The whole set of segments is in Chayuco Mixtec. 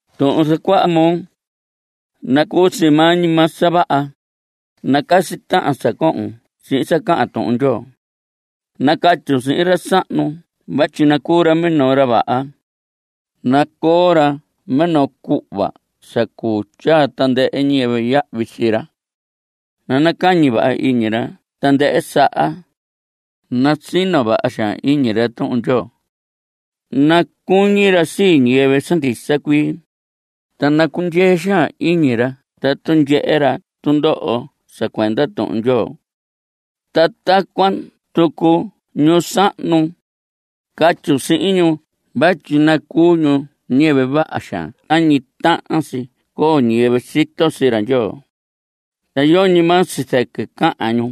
Tuhun zacuaha moo, nacuu si maa ñi maa sa vaha. (Nacasi tahan sa cohon sihin sa cahan Tuhun Ndyoo.) Nacatyun sihin ra sahnu vatyi nacuu ra minoo ra vaha. Nacoo ra minoo cuhva sa cuu tyaa tandɨhɨ ñiyɨvɨ yahvi sii ra. Nanacañi vaha iñi ra tandɨhɨ saha. Nasino vaha xaan iñi ra Tuhun Ndyoo. Nacuñi ra sii ñiyɨvɨ sa ndisa cuii, ta nacundyee xaan iñi ra tatu ndyehe ra tundoho sa cuenda Tuhun Ndyoo. Ta tacuan tucu ñu sahnu. Catyun sihin ñu vatyi nacuu ñu ñiyɨvɨ vaha xaan tañi tahan si coo ñiyɨvɨ sito sii ra Ndyoo. Ta yoñi maa sii zɨquɨ cahan ñu.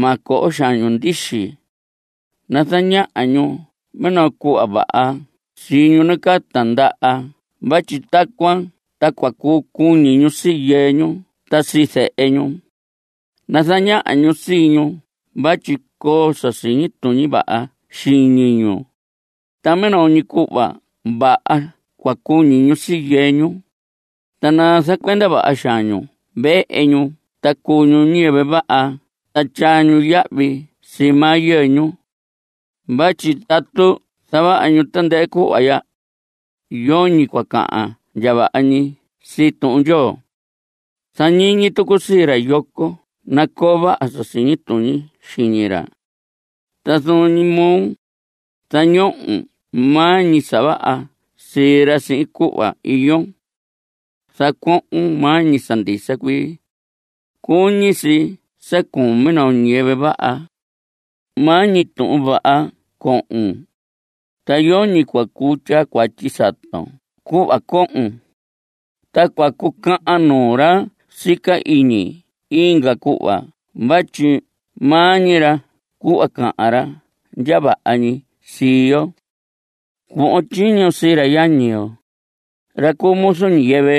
Ma coho xaan ñu ndixi. Nazañaha ñu minoo cuhva vaha sii ñu nacaa tindaha vatyi tacuan ta cua cuñi ñu sii yɨɨ ñu ta sii zehe ñu. Nazañaha ñu sii ñu vatyi coo sa siñi tuñi vaha xiñi ñu, ta minoo ñi cuhva vaha cua cuñi ñu sii yɨɨ ñu. Ta nazacuenda vaha xaan ñu vehe ñu ta cuu ñu ñiyɨvɨ vaha ta tyaa ñu yahvi sii maa yɨɨ ñu. Vatyi tatu zavaha ñu tandɨhɨ cuhva ya, yoñi cua cahan ndya vaha ñi sii Tuhun Ndyoo. Zañiñi tucun sii ra yoco nacoo vaha sa siñi tuñi xiñi ra. Ta zuun ñi moo, zañohon maa ñi sa vaha sii ra sihin cuhva iyon. Zacuohon maa ñi sa ndisa cuii. Cuñi si sa cuun minoo ñiyɨvɨ vaha. Maa ñi tuhun vaha cohon, ta yoñi cua cuu tyaa cuatyi saton cuhva cohon. Ta cua cucahan nuu ra sica iñi inga cuhva vatyi ma ñihi ra cuhva cahan ra ndya vaha ñi sii yo. Cuhvon tyiño sii ra yañi yo, ra cuu muzu ñiyɨvɨ,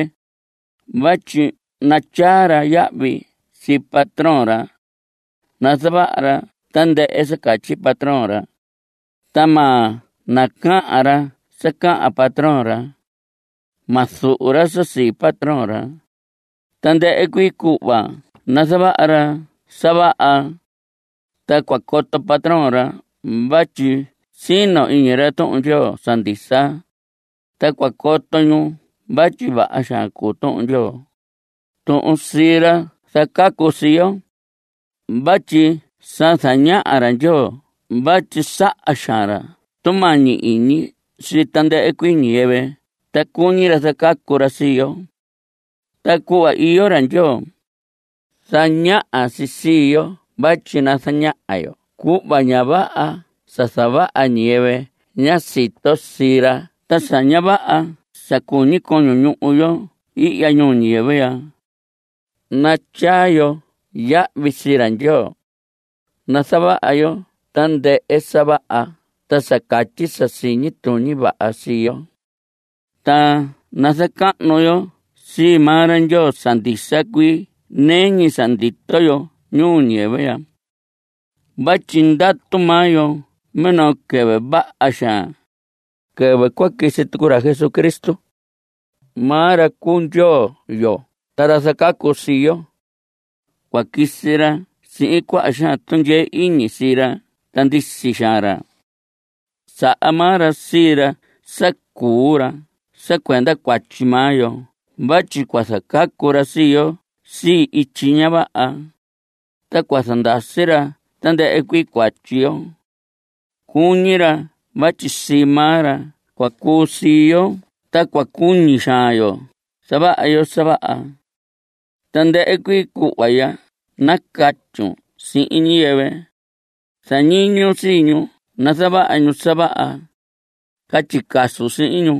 vatyi natyaa ra yahvi sii patrón ra. Nazavaha ra tandɨhɨ sa catyi patrón ra, ta ma nacahan ra sa cahan patrón ra. Ma zuhu ra sa sii patrón ra. Tandɨhɨ cuii cuhva nazavaha ra sa vaha. Ta cua coto patrón ra vatyi sino iñi ra Tuhun Ndyoo sa ndisa, ta cua coto ñu vatyi vaha xaan cuu Tuhun Ndyoo, tuhun sii ra zacacu sii yo. Vatyi sa zañaha ra Ndyoo vatyi saha xaan ra tumañi iñi sii tandɨhɨ cuii ñiyɨvɨ ta cuñi ra zacacu ra sii yo. Ta cuhva iyo ra Ndyoo, zañaha si sii yo vatyi nazaña yo cuhva ña vaha sa zavaha ñiyɨvɨ ña sito sii ra ta sa ña vaha sa cuñi coño ñuhu yo ihya ñuu ñiyɨvɨ ya. Natyaa yo yahvi sii ra Ndyoo. Nazavaha yo tandɨhɨ sa vaha ta sa catyi sa siñi tuñi vaha sii yo. Ta nazacahnu yo sii maa ra Ndyoo sa ndisa cuii nɨɨ ñi sa ndito yo ñuu ñiyɨvɨ ya. Vatyi ndatu maa yo minoo quɨvɨ vaha xaan, quɨvɨ cua quisi tucu ra Jesucristo. Maa ra cuu Ndyoo yo ta ra zacacu sii yo. Cua quisi ra sihin cuaha xaan tundyee iñi sii ra ta ndisi xaan ra. Saha maa ra sii ra sa cuu ra sa cuenda cuatyi maa yo vatyi cua zacacu ra sii yo sii ityi ña vaha, ta cua zandasi ra tandɨhɨ cuii cuatyi yo. Cuñi ra vatyi sii maa ra cua cuu sii yo ta cua cuñi xaan yo zavaha yo sa vaha. Tandɨhɨ cuii cuhva ya nacatyun sihin ñiyɨvɨ. Zañiñun sii ñu nazavaha ñu sa vaha. Catyi casun sihin ñu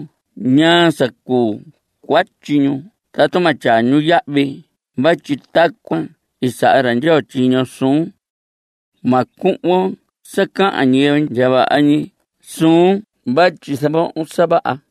ñaa sa cuu cuatyi ñu tatu ma tyaa ñu yahvi vatyi tacuan i saha ra Ndyoo tyiño suun. Ma cuhvon sa cahan ñiyɨvɨ ndya vaha ñi suun vatyi zavohon sa vaha.